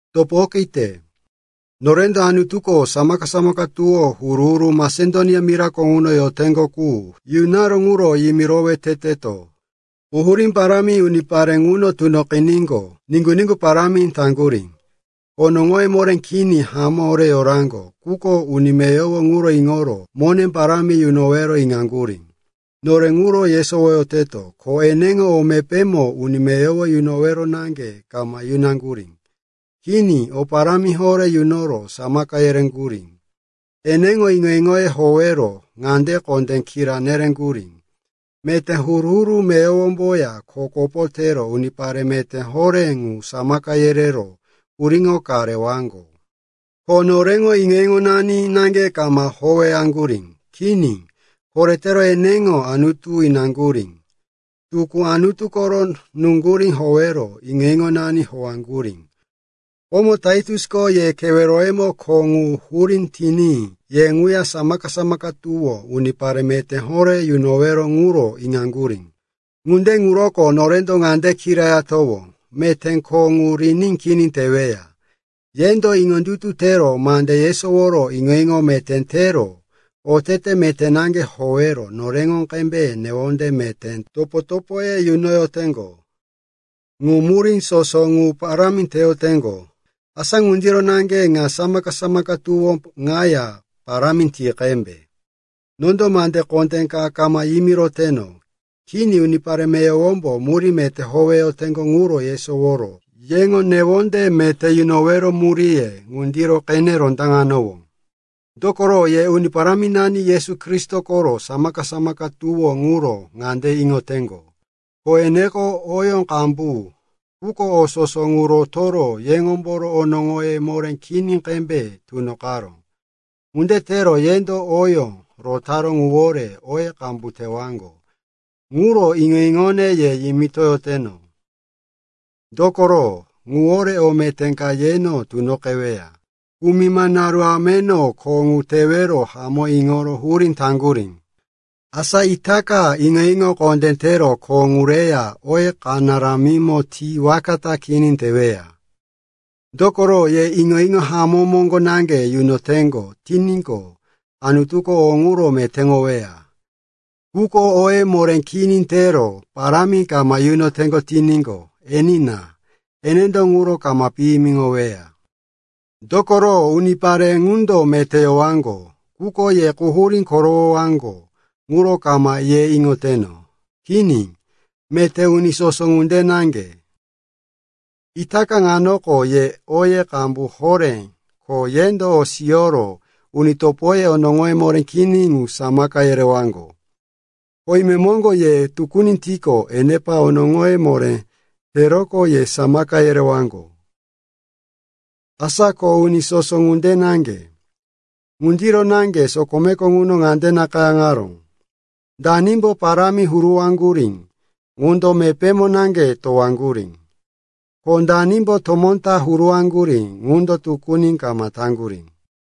Topo okite, norendo Anutuko samaka-samaka tuwó huru-huru Masedonia mirako ŋuno yoteŋgo qu yunaró ŋuro yimirowe teteto. Quhurí parámi unipare ŋuno tunoqiníqo, niŋgu-niŋgu parámi taŋgurí. Onoŋoye moré kini hamó horé yoraŋgo, quko uni meyowo ŋuro iŋoro mone parámi yunowero iŋaŋgurí. No ŋuro yesowoteno, ko eneŋo o mepémo uni meyowo yunowero naŋge kama yunaŋgurí. Kini, o parámi horé yunoro samaka yereŋgurí. Eneŋo iŋo-iŋoye howero ŋande kondé kira nereŋgurí, meté huru-huru meyowomboya kho kopo tero unipare meté horé ŋu samaka yerero puriŋo ka rewaŋgo. Ko noreŋo iŋo-iŋonani naŋge kama howaŋgurí. Kini, koretero eneŋo Anutu inaŋgurí, tukú Anutu koro nuŋgurí howero iŋo-iŋonani howaŋgurí. Komo Taitusko ye keweroyemo kho ŋu hurí tiní ye ŋuya samaka-samaka tuwó unipare meté horé yunowero ŋuro iŋaŋgurí. Ŋunde ŋuroko norendo ŋande kirayatowó, meté kho ŋu riní kini teweya. Yendo iŋondutu tero mande yesoworo iŋo-iŋo meté tero otete meté naŋge howero noreŋo qembe newonde meté topo-topoye yunoyoteŋgo. Ŋu murí soso ŋu parámi teyoteŋgo. Asa ŋundiro naŋge ŋa samaka-samaka tuwó ŋaya parámi ti qembe. Nondo mande kondé ka kama yimiroteno. Kini, unipare meyowombo murí meté howeyoteŋgo ŋuro yesoworo yeŋo newonde meté yunowero muríye ŋundiro qene rondaŋewano. Dokoro ye Uni Paráminani Yesu Kristo koro samaka-samaka tuwó ŋuro ŋande iŋoteŋgo, ko eneko oyó qambu, quko o soso ŋu rotoro yeŋomboro onoŋoyó moré kini qembe tunoqaró. Ŋunde tero yendo oyó rotaró ŋuwore oye qambu tewaŋgo. Ŋuro iŋo-iŋone ye yimitoyoteno, dokoro ŋuwore o meté ka yeno tunoqeweya. Kumima naru ameno kho ŋu tewero hamó iŋoro hurí taŋgurí. Asa itaka iŋo-iŋo kondé tero kho ŋu reya oye kanaramimo ti waka ta kini teweya. Dokoro ye iŋo-iŋo hamó moŋgo naŋge yunoteŋgo tiníqo, Anutuko o ŋuro metéŋoweya. Quko oye moré kini tero parámi kama yunoteŋgo tiníqo, enina. Enendo ŋuro kama piyimiŋoweya. Dokoro unipare ŋundo meté yowaŋgo, quko, ye quhurí korowowaŋgo, ŋuro kama ye iŋoyoteno. Kini, meté uni soso ŋunde naŋge. Itaka ŋanoko ye oye qambu horé, ko yendo o siyoro uni topoye onoŋoye moré kini qu samaka yerewaŋgo. Ko imemoŋgo, ye tukuni tiqo, enepa onoŋoye moré teroqo ye samaka yerewaŋgo. Asa ko uni soso ŋunde naŋge. Ŋundiro naŋge sokomeko ŋuno ŋande nakayáŋaró, “Danimbo parámi huruwaŋgurí ŋundo mepémo naŋge towaŋgurí, ko danimbo tomó ta huruwaŋgurí ŋundo tukuni kama taŋgurí.”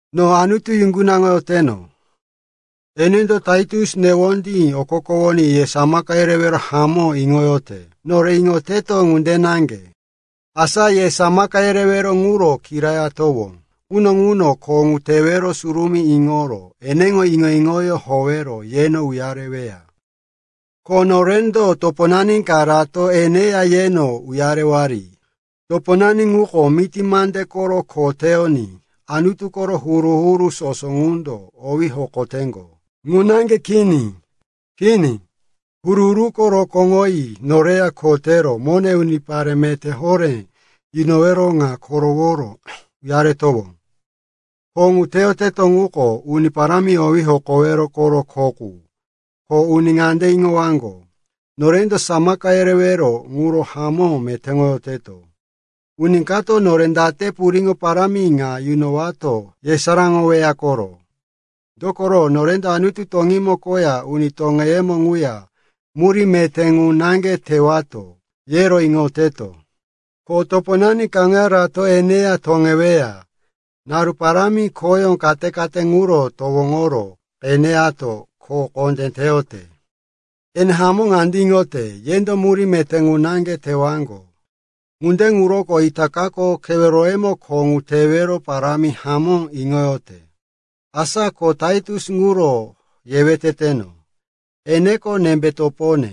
No Anutu yuŋgunaŋoyoteno. Enendo Taitus newondí okokowoní ye samaka yerewero hamó iŋoyote, nore iŋoyoteto ŋunde naŋge. Asa ye samaka yerewero ŋuro kirayatowó quno ŋuno kho ŋu tewero surumí iŋoro eneŋo iŋo-iŋoyó howero yeno uyareweya. Ko norendo toponani kaya rato eneya yeno uyarewari. Toponani ŋuko miti mande koro kho teyoní Anutu koro huru-huru soso ŋundo owí hokoyoteŋgo. Ŋu naŋge kini. Kini, huru-huruko rokóŋoyi noreya kho tero mone unipare meté horé yunowero ŋa koroworo uyarewato. Kho ŋu teyoteto ŋuko Uni Parámi owí hokowero koro kho qu, ko uni ŋande iŋowaŋgo, norendo samaka yerewero ŋuro hamó metéŋoyoteto. Uni kato nore date puriŋo parámi ŋa yunowato yesaráŋoweya koro. Dokoro norendo Anutu toŋímo koya uni toŋeyemo ŋuya murí meté ŋu naŋge tewato, yero iŋoyoteto. Ko toponani kaŋuya rato eneya toŋeweya. Naru parámi khoyó kate-kate ŋuro towoŋoro qeneyato kho kondé teyote. Ene hamó ŋande iŋote, yendo murí meté qu naŋge tewaŋgo. Ŋunde ŋuroko itakako keweroyemo kho ŋu tewero parámi hamó iŋoyote. Asa ko Taitus ŋuro yewe teteno, eneko nembe topone,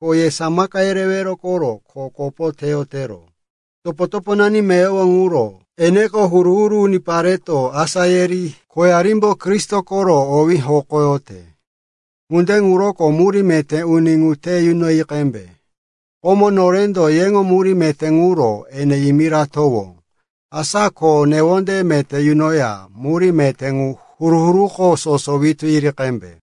ko ye samaka yerewero koro kho kopo teyotero. Topo-toponani meyowo ŋuro, eneko huru-huru unipareto asá yiri khoyarimbo Kristo koro owí hokoyote. Ŋunde ŋuroko murí meté uni ŋu te yunoyi qembe. Komo norendo yeŋo murí meté ŋuro ene yimiratowó. Asa ko newonde meté yunoya murí meté ŋu huru-huruko soso witú yiri qembe.